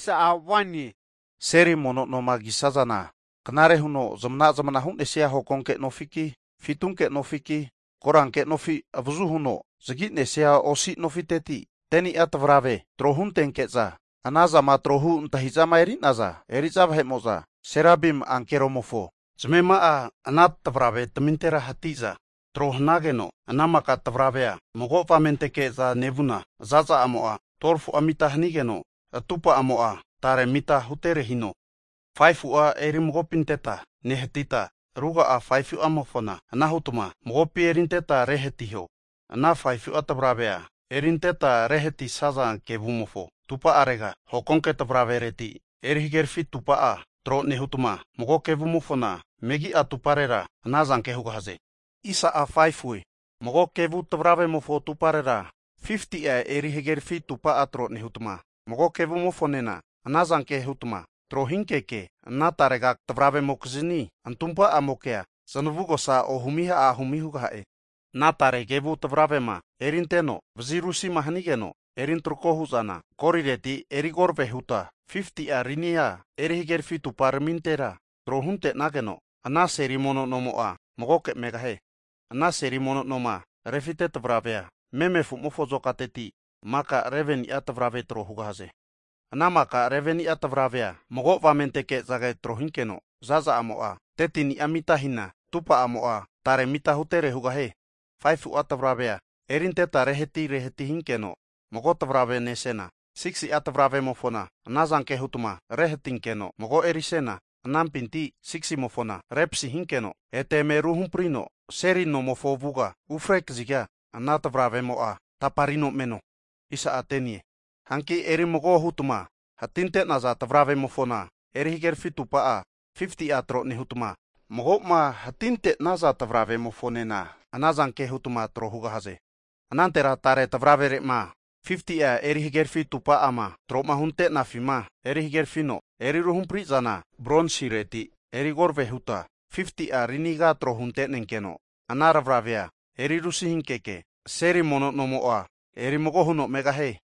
Hagi Seli mono noma kisazana knare huno zmana zmanama hu'nesia hokonke nofiki, fitunke nofiki, koranke nofi avazu huno zagi'nesia osi nofiteti 10ni'a tavrave trohutenke'za, ana zama trohu antahi'zama eri'naza eri'za vahe'mo'za, Serabimi ankeroramimofo zamema'a ana tavraveramintera hati'za tro hanageno, ana maka tavaravea mago avamenteke nevuna, za'za amo'a 12fu'a mita hanigeno, atupa'amo'a tare mita hutere hino. 5fu'a erimagopinteta nehatita ruga'a 5fu'amofona anahutma magopi erintetma rehatiho, ana 5fu'a tavravea erintetma rehatisaza kevumofo atupa'arega, hokonke tavravereti erihagerafi atupa'a tro nehutma, mago kevumofona megi'a atuparera anazanke hugahaze. Mago kevu tavravemofo atumparera 50'a eri hagerafi atupa'a tro nehutma, mago kevumofonena anazanke hutma trohinkeke, ana tarega tavravemokizni atumpa'amokea zamavugosa ohumi ahumi hugaha'e. Ana tare kevu tavravema erinteno vazirusi hanigeno erintrako hu'zana, gorileti erikorave huta 50'a rinia eri hagerafi atumparamintera tro hunte'nageno, ana seli mono nomo'a magoke megahie. Ana seli mono noma rufite tavravea meme afu'mofo azokateti maka 11ni'a tavrave tro hugahaze. Ana maka 11ni'a tavravea mago avamenteke'za trohinkeno, zaza'amo'a 13ni'a mita hina, atupa'amo'a tare mita hutere hugahie. 5fu'a tavravea erinteta rehati rehati hinkeno mago tavrave nesena, 6si'a tavravemofona anazanke hutma rehatinkeno mago erisena, anampinti 6simofona repasi hinkeno ete eme ruhamprino seli nomofo avuga ufre kaziga, ana tavravemo'a taparino meno. Hanki eri mago hutama hatinte'naza tavravemofona eri hagerafi atumpa'a, 50'a tro nehutma, mago'ma hatinte'naza tavravemofonena anazanke hutma tro hugahaze. Anantera tare tavravere'ma 50'a eri hagerafi atupa'ama troma hunte'nafima, erihagerafino eri ruhampri'zana bronsireti erikorave huta 50'a rini kana tro hutenenkeno, ana tare tavravea erirusi hinkeke seli mono nomo'a erimago huno megahie.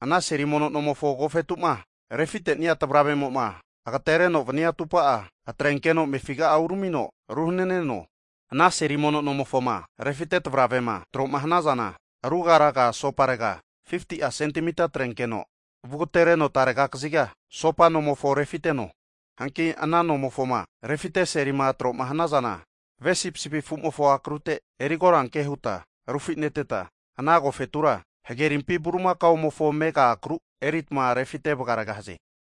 Ana seli mono nomofo agofetu'ma refite'nia tavravemo'ma agatereno vania atupa'a atrenkeno amefiga uramino ruhananeno. Ana seli mono nomofoma rufite tavravema tro'ma hanazana, rugaruga asoparega 50'a sentimita atrenkeno vugatereno tare kaziga asopa nomofona rufiteno. Hanki ana nomofoma rufite selima tro'ma hanazana, ve sipisipi afumofo akrute erikoranke huta rufineteta, ana agofetura hagerimpi bulimakaomofo amega akru eritma rufite vagaregahaze.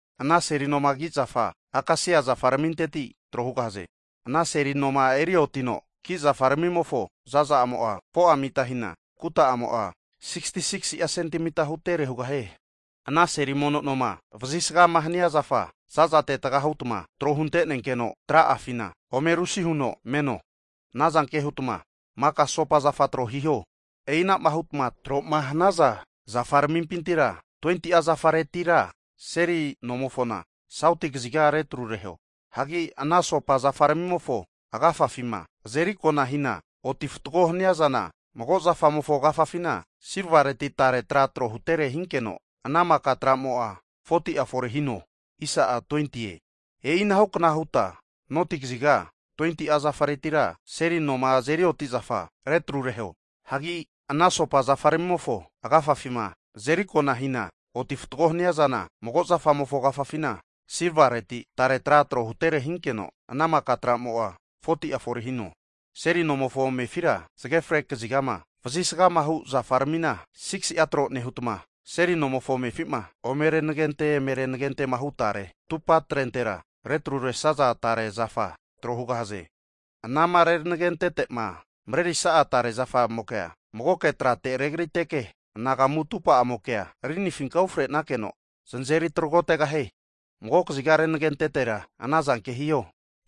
Ana seli noma ki zafa akasia zafaraminteti tro hugahaze. Ana seli noma eri otino ki'zafaramimofo zaza'amo'a, 4'a mita hina, kuta'amo'a 66'a sentemita hutere hugahie. Ana seli mono noma vazisgama hania zafa zazate taga hutma tro hunte'nenkeno tra'afina ome rusi huno meno. Anazanke hutma maka asopa zafa tro hiho. E'i anama hutama tro'ma hanaza zafaramimpintira 20'a zafaretira seli nomofona sauti kaziga retrureho. Hagi ana asopa zafaramimofo agafafima azerikona hina oti fatgo hania zana, mago zafamofo agafafina silvareti tare tra trohutere hinkeno, ana maka tra'mo'a 40'a fore hino. E'i anahukna huta noti kaziga 20'a zafaretira seli noma azeri oti'zafa retrureho. Hagi ana asopa zafaramimofo agafafima azerikona hina oti fatgo haniazana, mago zafamofo agafafina silvareti tare tra trohutere hinkeno, ana maka tra'mo'a 40'a fore hino. Seli nomofo amefira zage fre kazigama vazisgamahu zafaramina 6'a tro nehutma, seli nomofo amefi'ma ome renegente eme renagentehu tare atupatrentera retruresaza tare zafa tro hugahaze. Anama renagentete'ma marerisa'a tare zafamokea, magoke trate regriteke anagamu atupa'amokea rinifinka ufre'nakeno znazeri tragotegahie. Mago kaziga renagentetera anazanke hiho.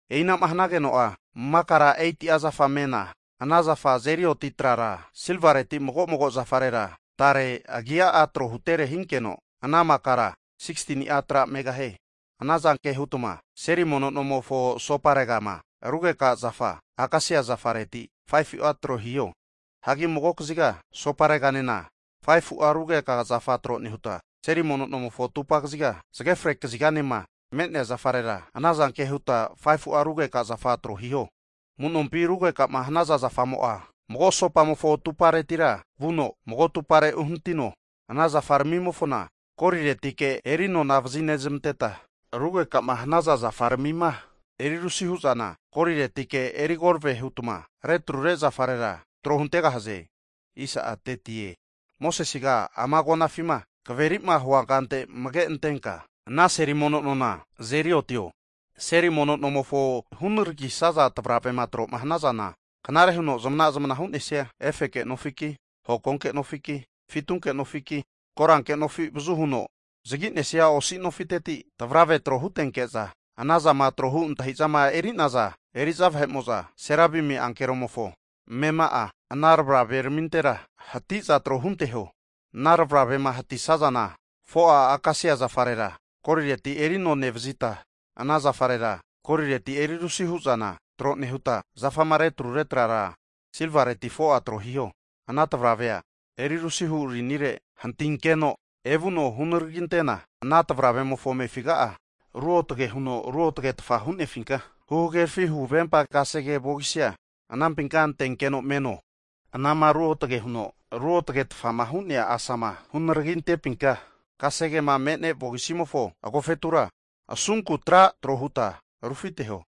E'inama hanageno'a makara 8'a zafa mena, ana zafa azeri oti trara silvareti mago mago zafarera tare agi'a trohutere hinkeno ana makara 16ni'a tra megahie. Ana zanke hutma seli mono nomofo asoparegama rugekahu zafa akasia zafareti 5fu'a tro hiho. Hagi mago kaziga (saut) asopareganena 5fu'a rugeka zafa tro nehuta, seli mono nomofo atupa kaziga zage fre (west) kaziganema me'nea zafarera anazanke huta 5fu'a rugeka zafa tro hiho. Amu'nompi rugeka'ma hanaza zafamo'a mago asopamofo atuparetira vuno, mago atupare uhanitino. Ana zafaramimofona goliretike erinona vazinezamanteta, rugekama hanaza zafaramima erirusi hu'zana goliretike erikorave hutma retrure zafarera tro huntegahaze. Mosesega ama agonafima kaveri'ma huankante amage antenka ana seli mono nona azeri otio. Seli mono nomofo hunaragisaza tavravema tro'ma hnazana knare huno zmana zmanama hu'nesia efeke nofiki hokonke nofiki, fitunke nofiki, koranke nofi avazu huno zagi'nesia osi nofiteti tavravea tro hutenke'za, ana zama trohu antahi'zama eri'naza eri'za vahe'mo'za, Serabimi ankeroramimofo amema'a ana tavraveramintera hati'za tro hunteho. Ana tavravema hantisazana, 4'a akasia zafarera golireti eri ano nevazita, ana zafarera golireti eri rusi hu'zana tro nehuta zafama retrure trara silvaleti 4'a tro hiho. Ana tavravea erirusihu rinire hantinkeno evuno hunaragintena ana tavravemofo amefiga'a, ruotage huno ruotgetfa hu'nefinka huhagerafi huvempa kasege vogisia anampinka antenkeno meno. Anama ruotage huno ruotagetfa hu'nea asama hunaragintepinka kasegema me'ne vogisimofo agofetura asunku tra trohuta rufiteho.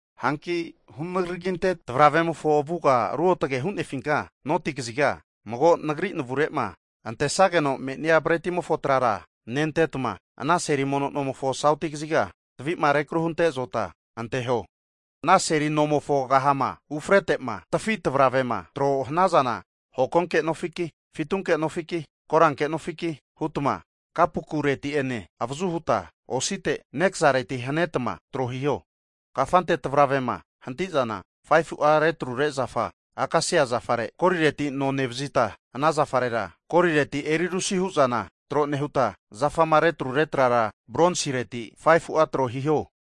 Hanki hunaraginte tavaravemofo avuga ruotage'ma hu'nefina, noti kaziga mago Nagri navure'ma antesageno me'nia bretimofo trara nentetma, ana seli mono nomofo sauti kaziga tavi'ma rekaruhunte lambe tavi zota anteho. Ana seli nomofo kahama ufrete'ma tafi tavravema tro hanazana, hokonke nofiki, fitunke nofiki, koranke nofiki hutma, kapokureti'ene avazu huta osite nekazareti hanetma tro hiho. Kafante tavravema hanti'zana 5fu'a retrure zafa akasia zafare golireti ano nevazita, ana zafarera golireti eri rusi hu'zana tro nehuta, zafama retrure trara bronsireti 5fu'a tro hiho.